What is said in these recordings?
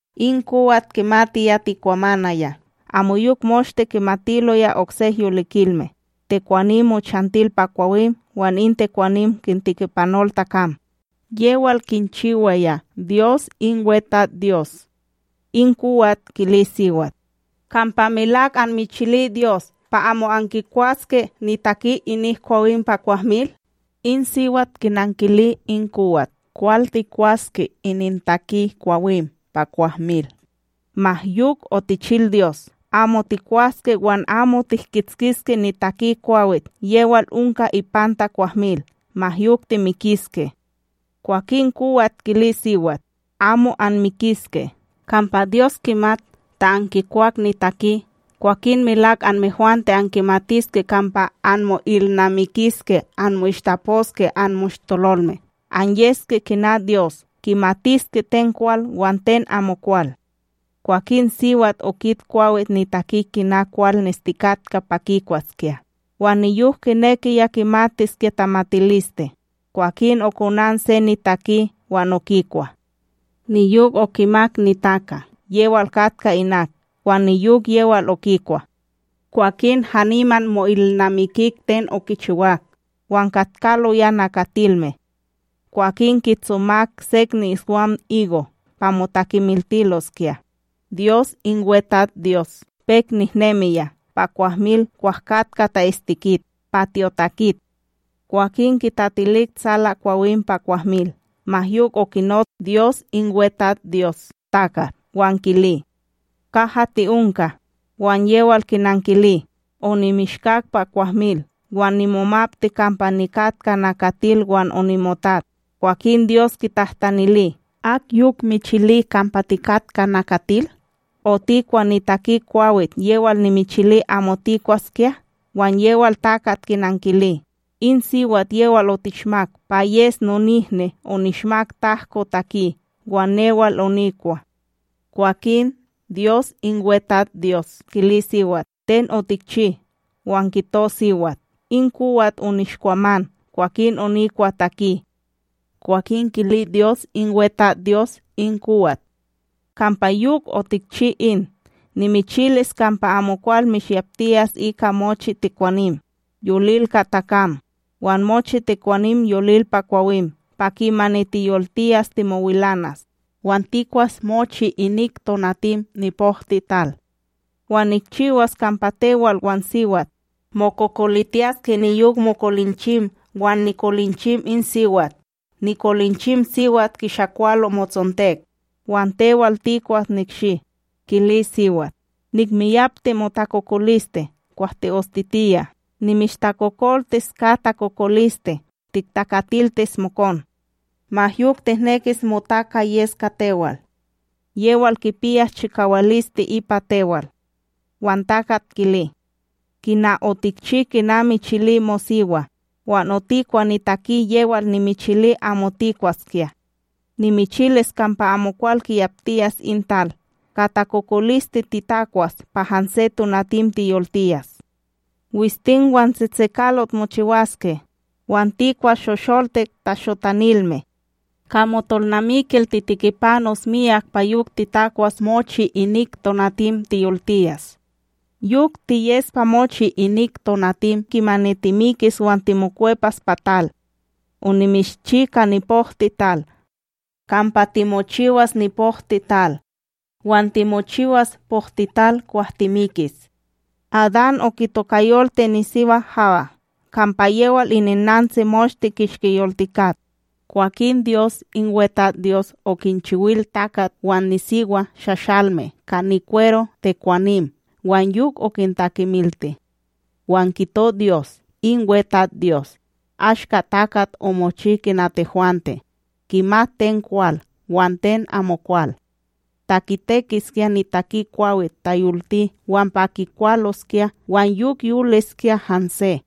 In kowat kimatiya tekwamanaya, amoyok moshte kimatiloya oksek yolikilme, tekwanim mochantil pa kwawim wan in tekwanim kintikipanol takam, yewal kinchiwaya Dyos in WeTatsDyos. In kowat kili siwat: Kampa melak anmichili Dyos pa amo ankikwaske nitaki inik kwawim pa kwahmil? In siwat kinankili in kowat: ―Kwal tikwaske inintaki kwawim pa kwahmil. Ma yok otichil Dyos: “Amo tikwaske wan amo tihkitskiske nitaki kwawit, yewal onka ipanta kwahmil, ma yok timikiske.” Kwakin kowat kili siwat: ―Amo anmikiske! Kampa Dyos kimat, ta ankikwak nitaki, kwakin melak anmehwante ankimatiske kampa anmo'ilnamikiske anmo'ishtaposke anmoshtololme anyeske kina Dyos, ankimatiske ten kwal wan ten amokwal. Kwakin siwat okit kwawit nitaki kina kwal nestikatka pa kikwaskya, wan niyok kinekiya kimatiskya tamatiliste, kwakin okonan se nitaki wan okikwa. Niyok okimak nitaka, yewal katka inak wan niyok yewal okikwa. Kwakin haniman mo'ilnamikik ten okichiwak, wan katkaloya nakatilme. Kwakin kitsomak sek ni'iswam igo' pa motakemiltiloskya. Kikakiloya Dyos in WeTatsDyos pek nehnemiya pa kwahmil kwah katka ta'istikit pa tyotakit, kwakin kitatilik tsalakwawim pa kwahmil. Ma yok okinots Dyos in WeTatsDyos takat wan kili: ―Kaha ti'onka? Wan yewal kinankili: ―Onimishkak pa kwahmil, wan nimomapti kampa nikatka nakatil wan onimotat. Kwakin Dyos kitahtanili: ―Ak yok michili kampa tikatka nakatil? ―Otikwa nitaki kwawit yewal nimichili amo tikwaskya? Wan yewal takat kinankili: ―In siwat yewal otishmak pa yes nonihni onishmak tahko taki, wan newal onikwa. Kwakin Dyos in WeTatsDyos kili siwat: ―Ten otikchi? Wan kito siwat: ―In kowat onishkwaman kwakin onikwa taki. Kwakin kili Dyos in WeTatsDyos in kowat: “Kampa yok otikchi in, nimichilis kampa amokwal mishyaptiyas ika mochi tekwanim, yolil ka takam, wan mochi tekwanim yolil pa kwawim! Pa kimani tiyoltiyas timowilanas, wan tikwas mochi inik tonatim nipohtiTal. Wan nikchiwas kampa tewal wan siwat, mokokolitiyaske niyok mokolinchim wan nikolinchim in siwat, nikolinchim siwat kishakwalo motsontek, wan tewal tikwas nikshi.” Kili siwat: “Nihmiyapti motakokoliste kwah ti'ostitiya, nimishtakokoltis ka takokoliste tiktakatiltis mokon. Ma yok tihnekis motaka yes ka tewal. Yewal kipiyas chikawaliste ipa tewal.” Wan takata kili: “Kina otikchi kina michili mosiwa, wan otikwa nitaki yewal nimichili amo tikwaskya! Nimichilis kampa amokwal kiyaptiyas in tal! Ka takokoliste titakwas pa hanse tonatim tiyoltiyas. Wistim wan tsetsekalot mochiwaske, wan tikwas shosholtik tashotanilme. Ka motonalmikil titikipanos miyak pa yok titakwas mochi inik tonatim tiyoltiyas, yok tiyes pa mochi inik tonatim kimani timikis wan timokwepas pa tal onimishchi ka nipohtiTal. Kampa timochiwas nipohtiTal wan timochiwas pohtital kwah timikis.” Adán okitokayolti nisiwa Hawa, kampa yewal ininnantsi moshte kishki yoltikat. Kwakin Dyos in WeTatsDyos okinchiwil takatb wan nisiwa shashalme ka nikwero tekwanim wan yok okintakemilti. Wan kito Dyos in WeTatsDyos: “Ashka takat omochi kina tehwante, kimat ten kwal wan ten amokwal. Ta kitekiskya nitaki kwawit tayolti, wan pa kikwaloskya wan yok yoliske hanse.”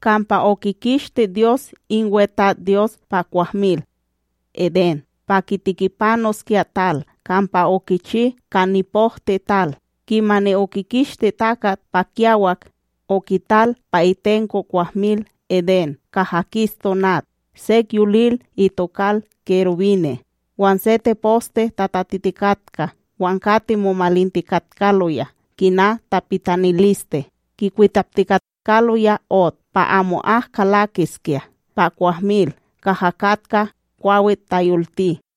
Kampa okikishti Dyos in WeTatsDyos pa kwahmil Edén, pa kitikipanoskya tal kampa okichi ka nipohtiTal. Kimani okikishti takat pa kiyawak, okital pa itenko kwahmil Edén kaha kis tonat sek yolil itokal kerubine', wan se teposte tatatitikatka wan kati momalintikatkaloya kina tapitaniliste, kikwitaptikatkaloya ot pa amo'ak kalakiskya pa kwahmil kaha katka kwawit tayolti.